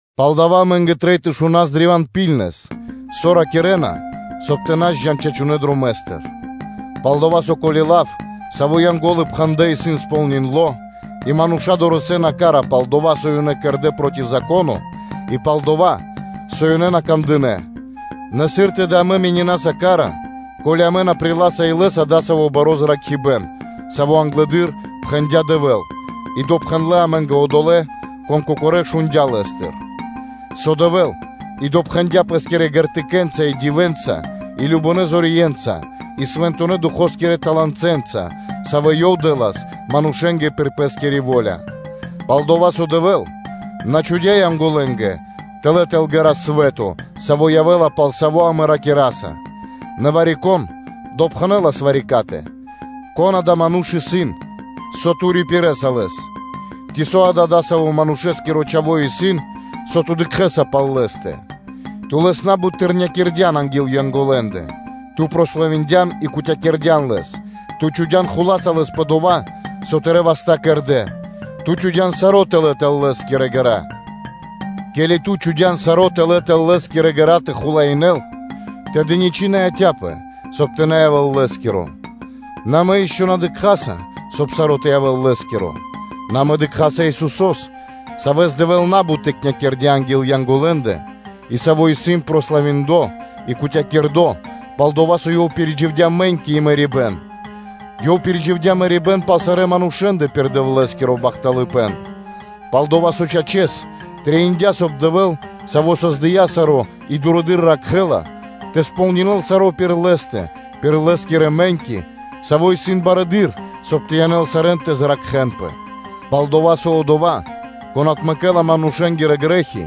Палдава́ амэ́нгэ трэй тэ рикираспэ древа́н ракхунэс кэ дова́, со ракирэ́на, соб (кай) тэ на джан криг чачунэ́ дромэ́стыр. Пал-дова́ со, ко́ли лав, саво́ Янго́лы пхэндлэ́, исын сполниндло (кэрдо́ кэ ко́нцо (кэ яго́ро)), и мануша́ дорэсэ́на ка́ра пал дова́, со ёнэ кэрдэ́ проти Зако́но и пал дова́, со ёнэ на кандынэ́, нэ сыр тэды амэ менинаса ка́ра, ко́ли амэ на приласа илэ́са дасаво баро́ зракхибэ́н, саво́ англэды́р пхэндя́ Дэвэ́л, и допхэндлэ амэ́нгэ одолэ́, кон кокоро́ шундя́ Лэ́стыр; со Дэвэ́л и допхэндя Пэ́скирэ знамение́нца (ґертыкэ́нца), и дивэ́нца и кажнонэ́ зорье́нца, и Свэнтонэ́ Духо́скирэ таланэнца, саво́ Ёв дэ́лас манушэ́нгэ пир Пэ́скири во́ля. Пал-дова́ со Дэвэ́л на чхудя́ Янголэнгэ тэлэ́ тэл ґэра́ свэ́то, саво́ явэ́ла, пал саво́ амэ ракираса: нэ вари-кон допхэнэлас вари-катэ: “Кон адава́ ману́ш исын, со Ту рипирэса лэс? Ци со да дасаво манушэ́скиро чхаво́ исын, со Ту дыкхэ́са пал лэ́стэ? Ту лэс на́бут тыкнякирдян анги́л Янголэндэ, ту прославиндян и кутякирдян лэс, Ту чхудя́н хула́са лэс пэ дова́, со Тырэ́ васта́ кэрдэ́, Ту чхудя́н саро́ тэлэ́ тэл лэ́скирэ ґэра́. Ке́ли Ту чхудя́н саро́ тэлэ́ тэл Лэ́скирэ ґэра́ тэ хулаинэ́л, тэды ничы́ на яця́пэ, соб (кай) тэ на явэ́л лэ́скиро. Нэ амэ ишчо (инкэ́) на дыкхаса, соб (кай) саро́ тэ явэ́л лэ́скиро”, нэ амэ дыкхаса Исусо́с, Савэс Дэвэ́л на́бут тыкнякирдя анги́л Янголэндэ, и Саво́ исын прославиндло и кутякирдо, пал-дова́ со Ёв пиридживдя мэ́ньки и мэрибэ́н; Ёв пиридживдя мэрибэ́н пал сарэ́ манушэ́ндэ пир Дэвлэ́скиро бахталыпэ́н. Пал-дова́ со, чачэс, трэиндя́, соб (кай) Дэвэ́л, Саво́ создыя́ саро́ и дурэды́р ракхэ́ла, тэ сполнинэл саро́ пир Лэ́стэ пир Лэ́скирэ мэ́ньки, Саво́ исын Лыджаибнаскиро, соб (кай) тэ янэл сарэ́н тэ зракхэнпэ. Пал-дова́ со Одова́, Кон отмэкэ́ла манушэ́нгирэ грэ́хи,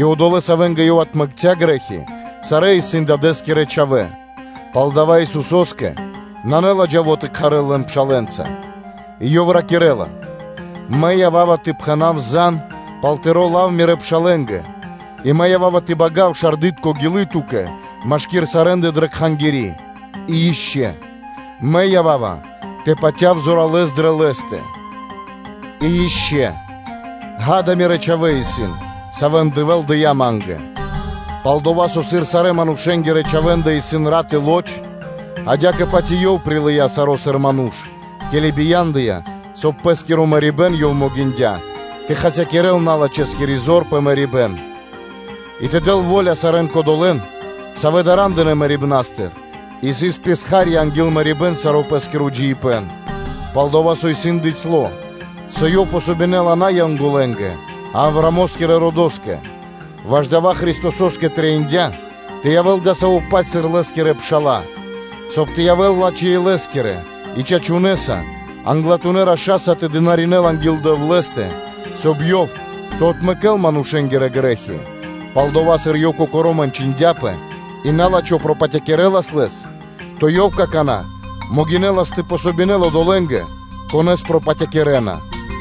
и одолэ́, савэ́нгэ Ёв отмэкця́ грэ́хи, сарэ́ исын Дадэ́скирэ чхавэ́, палдава́ Исусо́скэ нанэ ладжаво тэ кхарэл лэн пшалэ́нца; и Ёв ракирэ́ла: “Мэ ява́ва тэ пхэна́в зан пал Тыро́ лав Мирэ́ пшалэ́нгэ, и Мэ ява́ва тэ бага́в шарды́тко гилы́ Ту́кэ машки́р сарэ́ндэ дрэ Кхангири́.” И ишчо (инкэ́): “Мэ ява́ва тэ патяв зоралэ́с дрэ Лэ́стэ. И ишчо (инкэ́): “Ѓа́да, Мирэ́ чхавэ́ исын, савэ́н Дэвэ́л дыя́ Ма́нгэ.” Пал-дова́, со сыр сарэ́-манушэ́нгирэ чхавэ́ндэ исын рат и лоч (плоть), адя́кэ-паць и Ёв прилыя́ саро́, сыр ману́ш, ке́ли бия́ндыя, соб (кай) пир Пэ́скиро мэрибэ́н Ёв могиндя́ тэ хасякирэ́л налачхэскири зор пэ мэрибэ́н; и тэ дэл во́ля сарэ́нгэ кодолэ́нгэ, савэ́ дара́ндынэ мэрибна́стыр и сыс писха́рья анги́л мэрибэ́н саро́ пэ́скиро джиибэ́н. Пал-дова́ со исын бицяло́, со Ёв помогинэла на Янголэнгэ, а Авраамо́скирэ родо́скэ. Ваш дава́ Христосо́скэ трэиндя́ тэ явэ́л адасаво́-паць, сыр Лэ́скирэ пша́ла, соб (кай) ёв тэ явэ́л лачхэ́-илэ́скиро и чачуно́ Англатуно́ Раша́й тэ дынаринэ́л анги́л Дэвлэ́стэ, соб (кай) Ёв тэ отмэкэ́л манушэ́нгирэ грэ́хи; пал-дова́ со, сыр Ёв кокоро́ мэнчиндяпэ и на́лачхо пропатякирэлас Лэс, то Ёв какана́ могинэ́ла тэ помогинэл одолэ́нгэ, конэ́с пропатякирэна.